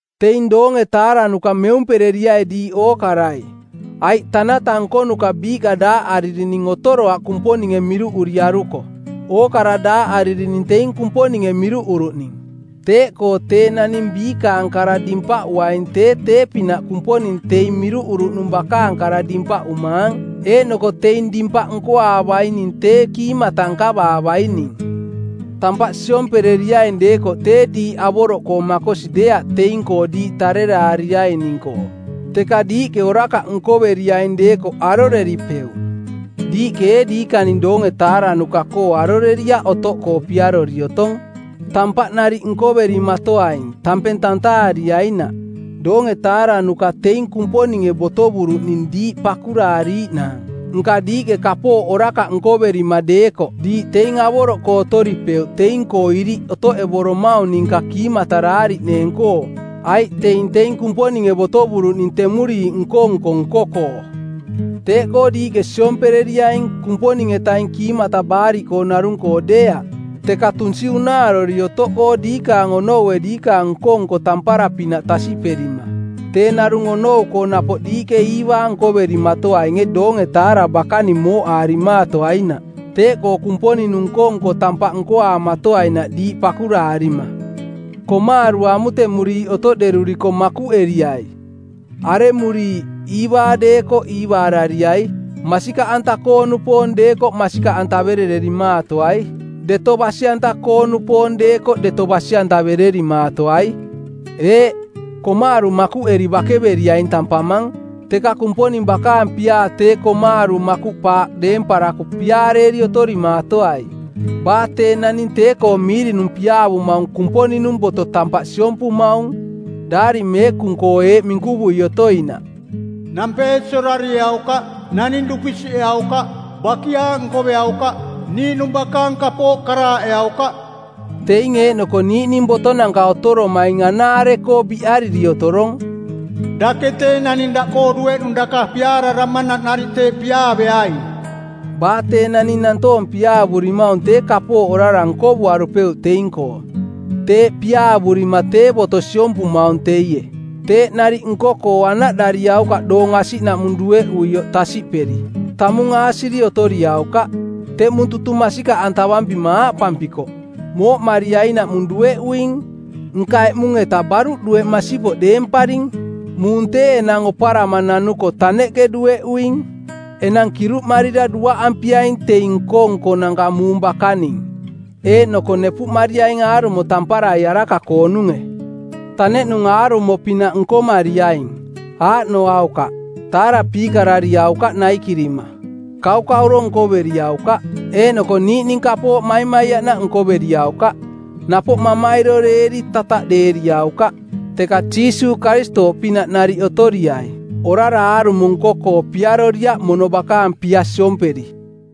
Teing doonge-taaranuka˜ meumpereriai diiꞌ ookarai, aiꞌ tanata nkonuka biiꞌka daaꞌaririning otoroaꞌ Kumponinge miruuꞌuriaruko. Ookara daaꞌaririning teing Kumponinge miruꞌuruꞌning. Teeꞌkoo tee naning biikaang kara dimpaꞌuaing tee tee-pinaꞌ Kumponing teing miruꞌuruꞌnung bakaang kara dimpaꞌumaang, eeꞌnoko teing dimpaꞌ nkoaavaining tee kiimata nkavaavaining. Tampaꞌ siompereriaing deekoꞌ tee diiꞌ avoroꞌkoo makosi deeaꞌ teing-koo diiꞌ tareraariaining-koo, teka diiꞌke orakaꞌ nkoveriaing deekoꞌ aroreripeuꞌ. Diiꞌke ee diikaning doonge-taaranuka-koo aroreriaꞌ otoꞌkoo piarori otong? Tampaꞌ nariꞌ nkoverimatoaing, tampeng tantaariainaꞌ. Doonge-taaranuka teing Kumponinge botovuruꞌning diiꞌ pakuraariiꞌnaang. Nka diiꞌke kapooꞌ orakaꞌ nkoverima deekoꞌ diiꞌ teing avoroꞌkoo otoripeuꞌ teing-koo iriꞌ otoꞌevoromaung ninka kiimataraariꞌneeng-koo, aiꞌ teing teing Kumponinge botovuruꞌning temuriiꞌ nko-nko nko-koo. Teeꞌkoo diiꞌke siomperiaing, Kumponing-etaing kiimata baariꞌkoo narung-koo deeaꞌ, teka tunsi unaarori otoꞌkoo diikaang onoue diikaang nko-nko tampara-pinaꞌ tasiꞌperima. Tee narung onou-koo napoꞌ diiꞌke iivaa nkoverimatoainge doonge-taara bakaning mooꞌaarimaatoainaꞌ. Teeꞌkoo Kumponing-nung nko-nko tampaꞌ nkoaamatoai diiꞌ pakuraarima. Komaaru amutemuriiꞌ otoꞌderuriko makuꞌeriai, aremuriiꞌ, iivaa deekoꞌ iivaarariai, masikaꞌanta-koo-nupoong deekoꞌ masikaꞌantaverererimaatoai, deto basi-anta-koo-nupoong deekoꞌ deto basi-antavererimaatoai. Eeꞌ, komaaru makuꞌeri bakeveriaing tampamang, teka Kumponing bakaang piaa tee komaaru makuꞌpaaꞌ deemparako piaareeri otorimaatoai. Baa tee naning tee-koo miirinung piaavumaung Kumponing-nung boto tampaꞌ siompumaung. Daari Meekung-koo eeꞌ minkuvui otoinaꞌ, “Nampeesi orarieaukaꞌ. “Naning dupisiꞌeaukaꞌ. “Bakiaaꞌ nkoveaukaꞌ. “Niiꞌnung bakaang kapooꞌ karaaꞌeaukaꞌ.” Teing eeꞌnoko niiꞌning botonanka otoromaing anaare-koo biꞌariri otorong, “Dake tee naning daꞌkoo dueꞌnung daka piaararamanaꞌ nariꞌ teeꞌ piaaveaing.” Baa tee naning nantoong piaavurimaung tee kapooꞌ orara nkovuarupeuꞌ teing-koo. Teeꞌ piaavurima tee boto siompumaung teie. Teeꞌ nariꞌ nko-koo anaꞌdariaukaꞌ doong asiꞌnaꞌmung dueꞌuioꞌ tasiꞌperi. Tamung aasiri otoriaukaꞌ. Teꞌmung tutung masikaꞌantavampima aaꞌpampikoꞌ, “Mooꞌmariainaꞌmung dueꞌuing.” Nka eꞌmung-eta baruꞌ dueꞌ masipoꞌ deemparing. Muung tee enang oparama nanuko taneꞌke dueꞌuing. Enang kiruꞌmarira duaꞌampiaing teing nko-nkonanka muung bakaning eeꞌnoko nepuꞌmariaing aarumo tamparai araka-koonunge. Taneꞌnung aarumo-pinaꞌ nkomariaing. Aaꞌnoaukaꞌ: taarapiikarariaukaꞌ naikirima, kaukauro nkoveriaukaꞌ, eeꞌnoko niiꞌning kapooꞌ maimaiaꞌnaꞌ nkoveriaukaꞌ, napoꞌ mamairoreeri tataꞌdeeriaukaꞌ. Teka Jiisuuꞌ Karistooꞌpinaꞌ nariꞌ otoriai. Orara aarumo nko-koo piaroriaꞌ mono bakaang pia siomperi.